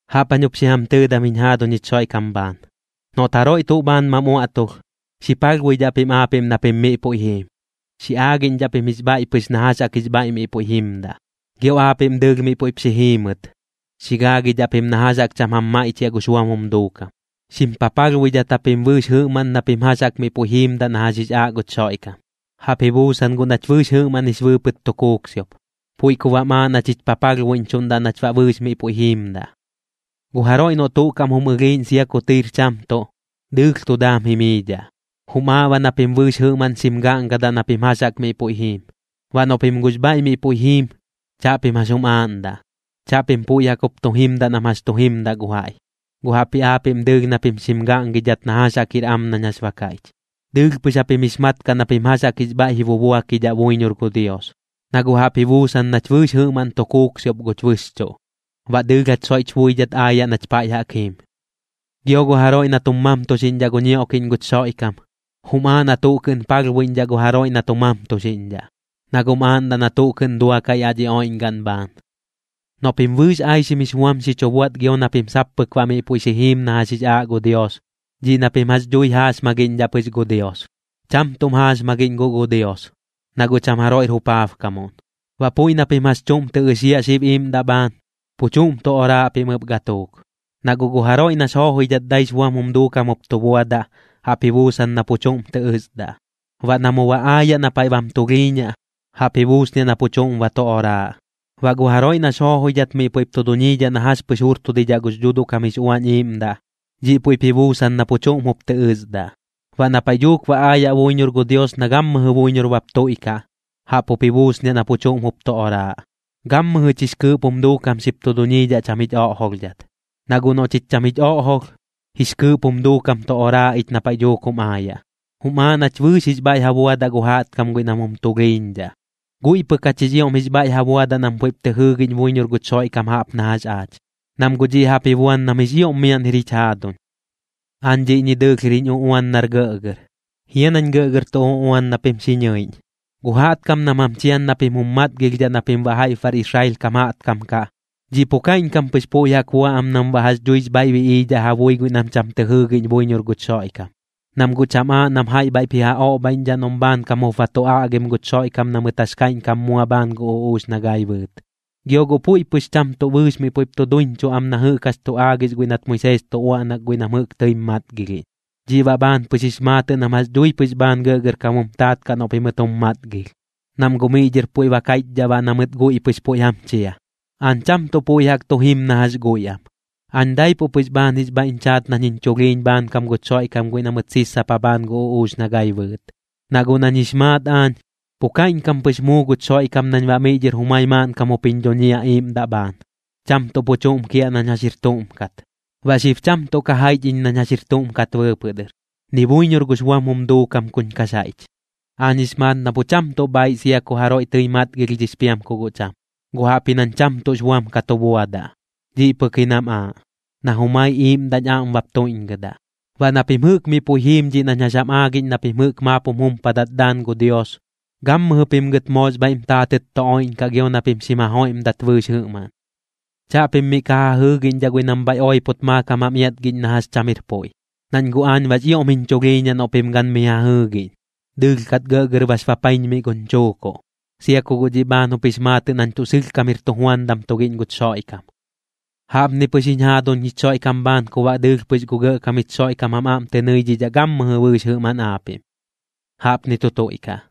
Jaꞌp jañ jup xi jam tɨɨdam jiñ jaaduñ jich Xoiꞌkam bhaan, noꞌt jaroiꞌ tuꞌ bhaan mam uaꞌtulh, xi palhbuidhaꞌ pim aapiꞌm na pim miꞌ puiꞌ jiim, xi aagiꞌñdhaꞌ pim jix bhaiꞌ pɨx na jax jaꞌk jix bhaiꞌ miꞌ puiꞌ jimdaꞌ. Gio aapiꞌm dɨɨlh miꞌ puiꞌp xi jiimɨt, xi gaagidhaꞌ pim na jax jaꞌk cham jam maiꞌchiaꞌ gux buam jum duukam. Xim papalhbuidhat japim bɨɨx jɨꞌmaꞌn na pim jax jaꞌk miꞌ puiꞌ jiimdaꞌ na jax jix aaꞌ guch Xoiꞌkam. Jaꞌp ji buusan guꞌ nach bɨɨx jɨꞌmaꞌn jix bɨɨpɨt tu kuuksiop, puiꞌ ku baꞌm aaꞌ nach jich papalhbuiꞌñchuꞌndaꞌ nach baꞌ bɨɨx miꞌ puiꞌ jiimdaꞌ. Gu jaroiꞌ noꞌ tuꞌ kaꞌm jum ɨlhiiꞌñ sia ku tɨir cham tuꞌ, dɨɨlh tu daam jimiidhaꞌ. Jum aaꞌ baꞌ na pim bɨɨx jɨꞌmaꞌn xim gaꞌngadaꞌ na pim jax jaꞌk miꞌ puiꞌ jiim. Baꞌ noꞌ pim guꞌx bhaiꞌ miꞌ puiꞌ jiim, chaꞌpim jax jum aaꞌndaꞌ. Chaꞌpim puiꞌ jaꞌk jup tu jimdaꞌ nam jax tu jimdaꞌ gu jaiꞌ, guꞌ jaꞌpji aapiꞌm dɨɨlh na pim xim gaꞌngidhat na jax jaꞌk jir am nañ jax ba kaiꞌch. Dɨɨlh pɨx japim jix mat kaꞌ na pim jax jaꞌk jix bhaiꞌ ji bubuakidhaꞌ buiñor gu Dios, na guꞌ jaꞌp ji buusan nach bɨɨx jɨꞌmaꞌn tu kuuksiop guch bɨxchuꞌ, baꞌ dɨɨlh jach soiꞌch buidhat aayaꞌ nach paiꞌ jaꞌk jiim. Gio gu jaroiꞌ na tum mamtuxiꞌñdhaꞌ gu ñioꞌkiꞌñ guch Xoiꞌkam, jum aaꞌ na tuꞌ kɨꞌn palhbuiꞌñdhaꞌ gu jaroiꞌ na tu mamtuxiꞌñdhaꞌ, na guꞌm aaꞌndaꞌ na tuꞌ kɨꞌn duakaꞌ yaꞌ dhi oiꞌñgaꞌn bhaan. Noꞌ pim bɨɨx aixim jix buam xi chu buaꞌt gio na pim sap pɨk baꞌ miꞌ puiꞌ xi jiim na jax jix aaꞌ gu Dios, dhiꞌ na pim jax dhui jaaxmagiꞌñdhaꞌ pɨx gu Dios. Cham tuꞌm jaaxmagiꞌñ guꞌ gu Dios, na guꞌ cham jaroiꞌr jupaabkamuꞌn. Baꞌ puiꞌ na pim jax chuꞌm tɨ ɨxiaꞌ xib iiꞌmdaꞌ bhaan, pu chuꞌm tu oraaꞌ pim ɨp gatuuk. Na guꞌ gu jaroiꞌ nax joojoidhat daix buam jum duukam jup tu buadaꞌ, jaꞌp ji buusan na pu chuꞌm tɨ ɨsdaꞌ. Baꞌ na mu ba aayaꞌ na paiꞌ bam tulhiiñaꞌ, jaꞌp ji buusniaꞌ na pu chuꞌm ba tu oraaꞌ. Baꞌ gu jaroiꞌ nax joojoidhat miꞌ puiꞌp tu duñiidhaꞌ na jax pɨx jurtudidhaꞌ gux Dhuuduꞌ kam jix Uañ Iiꞌmdaꞌ, dhiꞌ puiꞌp ji buusan na pu chuꞌm jup tɨ ɨsdaꞌ. Baꞌ na paiꞌ dhuuk ba aayaꞌ buiñor gu Dios na gammɨjɨ buiñor bap tuiꞌkaꞌ, jaꞌp jup ji buusniaꞌ na pu chuꞌm jup tu oraaꞌ. Gammɨjɨch jix kɨɨꞌp jum duukam xip tu duñiidhaꞌ cham jich oꞌjolhdhat. Na guꞌ noꞌ chich cham jich oꞌjolh, jix kɨɨꞌp jum duukam tu oraaꞌ ich na paiꞌ dhuuk jum aayaꞌ. Jum aaꞌ nach bɨɨx jix bhaiꞌ ja buadaꞌ gu jaꞌtkam guiꞌ nam jum tulhiiñdhaꞌ, guiꞌ pɨk jach jix ioꞌm jix bhaiꞌ ja buadaꞌ nam puiꞌp tɨ jɨɨgiꞌñ buiñor guch Xoiꞌkam jaꞌp na jax aach, nam guꞌ dhiꞌ jaꞌp ji buan nam jix ioꞌm miaꞌn jir jich jaaduñ. Aañ dhiꞌñi dɨɨlh jir jiñ uꞌuan nar gɇꞌgɇr. ¿Jia nañ gɇꞌgɇr tu uꞌuan na pim xi ñɨiꞌñ? Gu jaꞌtkam nam jam chian na pim jum matgilhdhaꞌ na pim baꞌ jaiꞌp bar Israel kam jaꞌtkam kaꞌ, dhiꞌ pu kaiꞌñkam pɨx puiꞌ jaꞌk bua am nam baꞌ jax dhuix bhaiꞌ biꞌiidhaꞌ ja bui guiꞌ nam cham tɨ jɨɨgiꞌñ buiñor guch Xoiꞌkam, nam guꞌ cham aaꞌ nam jaiꞌ bhaiꞌp ji ja oꞌbhaiꞌñdhaꞌ noꞌm bhaankam jup ba tu aꞌgim guch Xoiꞌkam na mɨt jax kaiꞌñkam mua bhaan gu uꞌuux na gai bɨɨt. Gio guꞌ puiꞌ pɨx cham tuꞌ bɨɨx miꞌ puiꞌp tu duiñchuꞌ am na jɨꞌk jax tu aagix guiꞌ nat Moisees tu uaꞌnak guiꞌ nam jɨꞌk tɨim matgilhiꞌñ. Dhiꞌ baꞌ bhaan jix maatɨꞌ nam jax dhui pɨx bhaan gɇꞌgɇrkam jum taat kaꞌ noꞌ pimɨt jum matgilh, nam guꞌ miꞌ dhɨr puiꞌ ba kaiꞌchdhaꞌ baꞌ na mɨt guiꞌ pɨx puiꞌ jam chia. Aañ cham tuꞌ puiꞌ jaꞌk tu jim na jax guiꞌ am, aañ daipuꞌ pɨx bhaan jix bhaiꞌñ chaat nañ jiñ chulhiiñ bhaankam guch Xoiꞌkam guiꞌ na mɨt sissapa bhaan gu uꞌuux na gai bɨɨt. Na guꞌ nañ jix maat aañ, pu kaiꞌñkam pɨx muu guch Xoiꞌkam nañ baꞌ miꞌ dhɨr jumai maaꞌnkam jup jiñ dhuñiaꞌ iiꞌmdaꞌ bhaan, cham tuꞌ pu chuꞌm kiaꞌ nañ jax jir tuꞌm kat. Baꞌ xib cham tuꞌ ka jaiꞌch iñ nañ jax jir tuꞌm kat bɨɨpɨꞌ dɨr, ni buiñor gux buam jum duukam kuñ kax jaiꞌch. Aañ jix maat na pu cham tuꞌ bhaaiꞌ sia ku jaroiꞌ tɨi matgilhdhix piam ku guꞌ cham, guꞌ jaꞌpji nañ cham tuꞌx buam ka tu buadaꞌ, dhiꞌ pɨk ji nam aaꞌ, na jumai iiꞌmdaꞌñ aꞌm bap tuiꞌñgɨdaꞌ. Baꞌ na pim jɨꞌk miꞌ puiꞌ jiim dhiꞌ nañ jax jam aagiꞌñ na pim jɨꞌk maap jum jumpadat daan gu Dios, gammɨjɨ pim gɨt moox bhaiꞌm taatɨt tu oiꞌñkaꞌ gio na pim xim ja joiꞌmdat bɨɨx jɨꞌmaꞌn. Chaꞌpim miꞌ ka ja jɨɨgiꞌñdhaꞌ guiꞌ nam bhaiꞌ oipot maakam jam iatgiꞌñ na jax cham jir puiꞌ, nañ guꞌ aañ baꞌx ioꞌm jiñ chulhiiñaꞌ noꞌ pim gan mi ja jɨɨgiꞌñ. Dɨɨlh kat gɇꞌgɇr bax bapaiñmiꞌ guñ chuukuꞌ, sia ku guꞌ dhiꞌ bhaan jup jix maatɨꞌ nañ tuꞌ sɨlhkam jir tujuandam tugiꞌñ guch Xoiꞌkam. Jaꞌpni pɨx jiñ jaaduñ jich Xoiꞌkam bhaan ku baꞌ dɨɨlh pɨx gu Gɇꞌkam jich Xoiꞌkam jam aꞌm tɨ nɨidhidhaꞌ gammɨjɨ bɨɨx jɨꞌmaꞌn aapiꞌm. Jaꞌpni tu tuiꞌkaꞌ.